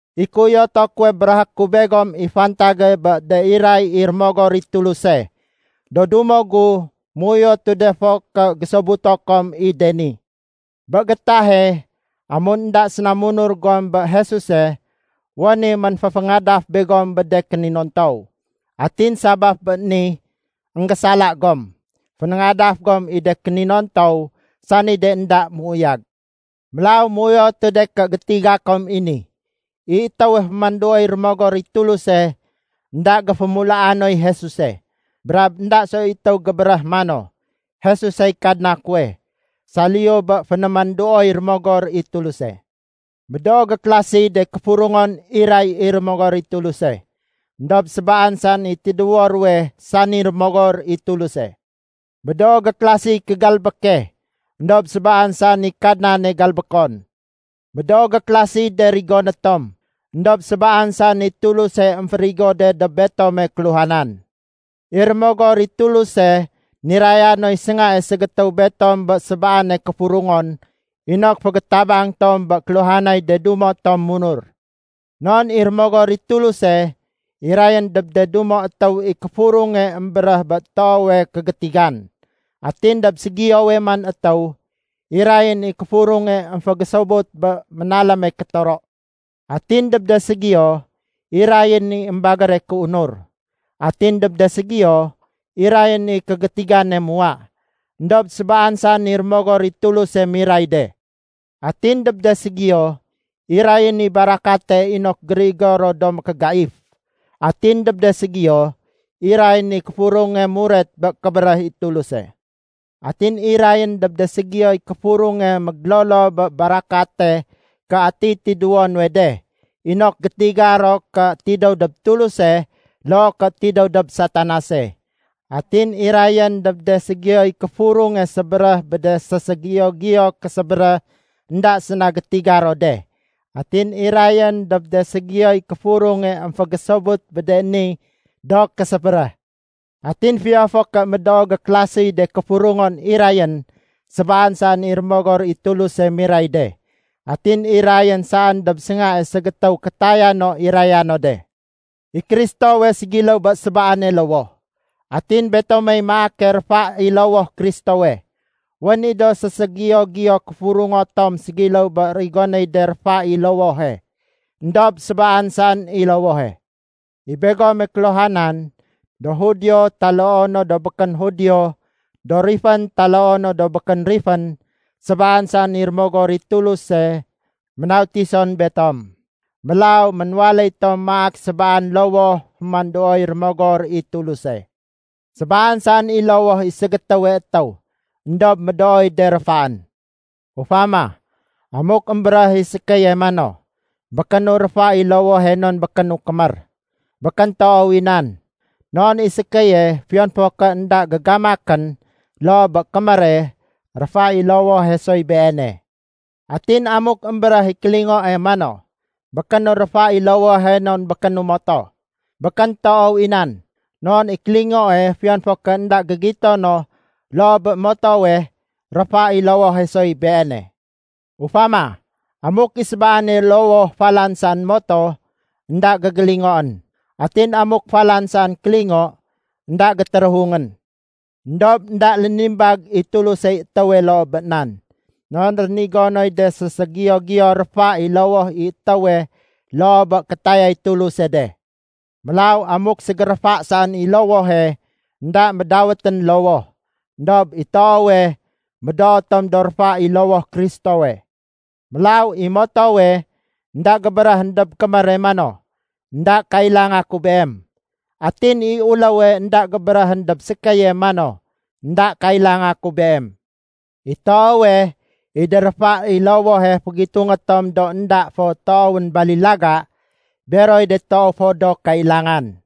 I kéuyoto kuwe béréhé ku begom i fantage bé de iray i Rémogor i Tuluse. Do dumo gu, méuyotu de fo ké gésobuto kom i de ni. Bé gétahe, amun énda séna munur gom bé Jesuse, wén i ménféféngadaf begom bé de kéninontow. Atin sabaf bé ni, énggésala gom, fénéngadaf gom i de kéninontow, sani de énda méuyag. Mélaw méuyotu de ké gétiga kom i ni. I étéwe fémanduoy Rémogor i Tuluse, énda géfémulaa noy Jesuse. Brab énda soy étéw gébéréh mano, “Jesusey Kadna kuwe,” saliyu bé fénémanduoy Rémogor i Tuluse. Médoo gékélasiy de kéfurungon iray i Rémogor i Tuluse, éndob sébaan saén i tidéwo ruwe sani Rémogor i Tuluse. Médoo gékélasiy kégalbéke, éndob sébaan saén i Kadnane galbékon. Médoo gékélasiy de rigoné tom, éndob sébaan saén i Tuluse émférigo de dob betome kéluhanan. I Rémogor i Tuluse niraya noy séngae ségétéw betom bé sébaane kéfurungon inok fégétabang tom bé kéluhanay de dumo tom munur. Non i Rémogor i Tuluse, irayén dob de dumo étéw i kéfurunge émbéréh bé toowe kégétigan. Atin dob ségiyowe man étéw, irayén i kéfurunge émfégésobut bé ménaléme kétoro. Atin dob de ségiyo, irayén i émbagére kéunur. Atin dob de ségiyo, irayén i kégétigane muwa. Endob sébaan saén i Rémogor i Tuluse miray de. Atin dob de ségiyo, irayén i barakate inok gérigo ro do mékégaif. Atin dob de ségiyo, irayén i kéfurunge muret bé kébéréh i Tuluse. Atin irayén dob de ségiyoy kéfurunge mégélolo bé barakate ké atiy tidéwo nuwe de, inok gétiga ro ké tidéw dob Tuluse loo ké tidéw dob Satanase. Atin irayén dob de ségiyoy kéfurunge sébéréh bé de séségiyo-giyo késébéréh énda séna gétiga ro de. Atin irayén dob de ségiyoy kéfurunge émfégésobut bé de ni do késébéréh. Atin fiyon fo ké médoo gékélasiy de kéfurungon irayén, sébaan saén i Rémogor i Tuluse miray de. Atin irayén saén dob séngae ségétéw kétaya no iraya no de. I Kristowe ségiléw bé sébaane lowoh. Atin betomey maake réfa i lowoh Kristowe. Wén i do séségiyo-giyo kéfurungo tom ségiléw bé rigonéy de réfa i lowohe. Endob sébaan saén i lowohe. I begome kéluhanan, do Judio taloo no do békén Judio, do rifén taloo no do békén rifén, sébaan saén i Rémogor i Tuluse ménautison betom. Mélaw ménwaléy tom maak sébaan lowoh fémanduoy Rémogor i Tuluse. Sébaan saén i lowoh i ségétéwe étéw éndob médooy de réfaén. Ufama, amuk émbéréh i sékéye mano, “Békénu réfa i lowohe non békénu kémér,” békén toow i nan. Non i sékéye, fiyon fo ké énda gégamakén loo bé kémére, réfa i lowohe soy beene. Atin amuk émbéréh i kélingoe mano, “Békénu réfa i lowohe non békénu moto,” békén toow i nan. Non i kélingoe, fiyon fo ké énda gégito no loo bé motowe, réfa i lowohe soy beene. Ufama, amuk i sébaane lowoh falan saén moto, énda gégélingoén. Atin amuk falan saén kélingo, énda gétéréhungén. Endob énda lénimbag i Tulusey étéwe loo bé nan. Non rénigo noy de séségiyo-giyo réfa i lowoh i étéwe loo bé kétayay Tuluse de. Mélaw amuk ségéréfa saén i lowohe, énda médawétén lowoh. Endob i toowe, médoo tom do réfa i lowoh Kristowe. Mélaw i motowe énda gébéréhén dob kémére mano, “Enda kailanga ku beem.” Atin i uléwe énda gébéréhén dob sékéye mano, “Enda kailanga ku beem.” I toowe, i de réfa i lowohe fégitungé tom do énda fo toowén balilaga, beroy de toow fo do kailangan.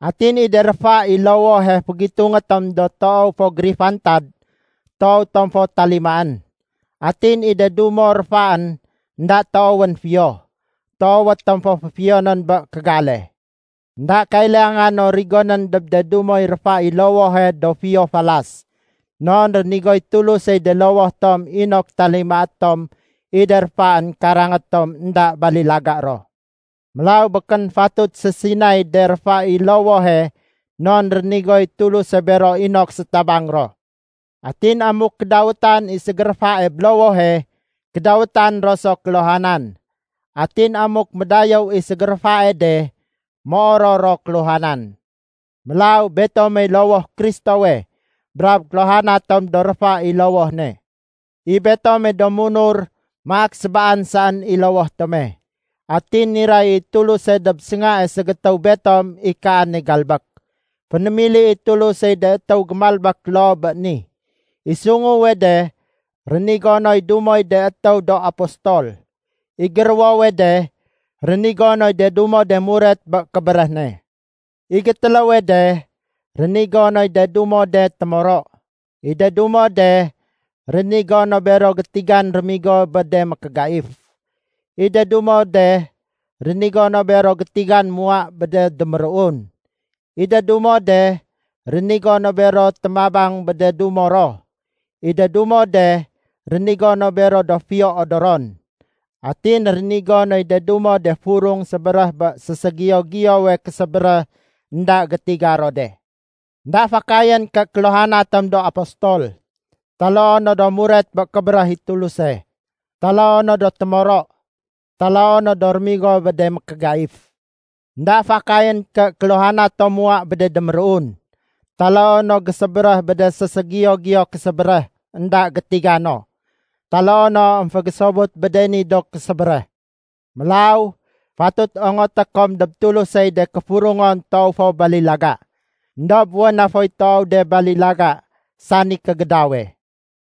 Atin i de réfa i lowohe fégitungé tom do toow fo gérifantad, toowé tom fo talimaén. Atin i de dumo réfaén énda toowén fiyo, toowé tom féfiyonén bé kégale. Enda kailanga no rigonén dob de dumoy réfa i lowohe do fiyo falas. Non rénigoy Tulusey de lowoh tom inok talimaé tom i de réfaén karangé tom énda balilaga ro. Mélaw békén fatut sésinay de réfa i lowohe non rénigoy Tuluse bero inok sétabang ro. Atin amuk kédawétan i ségéréfae bé lowohe, kédawétan ro so kéluhanan. Atin amuk médayéw i ségéréfae de, méoror ro kéluhanan. Mélaw betomey lowoh Kristowe, brab kéluhana tom do réfa i lowoh ne. I betome do munur maak sébaan saén i lowoh tome. Atin niray i Tuluse dob séngae ségétéw betom i kaane galbék. Fénémili i Tulusey de étéw gémalbék loo bé ni. I sunguwe de, rénigo noy dumoy de étéw do apostol. I géruwowe de, rénigo noy de dumo de muret bé kébéréh ne. I gétéléwe de, rénigo noy de dumo de témoro. I de dumo de rénigo no bero gétigan rémigo bé de mékégaif. I de dumo de rénigo no bero gétigan muwa bé de déméruun. I de dumo de rénigo no bero témabang bé de dumo ro. I de dumo de rénigo no bero do fiyo odoron. Atin rénigo noy de dumo de furung sébéréh bé séségiyo-giyowe késébéréh énda gétiga ro de. Enda fakayén ké kéluhana tom do apostol, taloo no do muret bé kébéréh i Tuluse, taloo no do témoro, taloo no do rémigo bé de mékégaif. Enda fakayén ké kéluhana tom muwa bé de déméruun, taloo no gésébéréh bé de séségiyo-giyo késébéréh énda gétigano, taloo no émfégésobut bé de ni do késébéréh. Mélaw fatut ongoté kom dob Tulusey de kéfurungon toow fo balilaga. Endob wén na foy toow de balilaga sani kégédawe.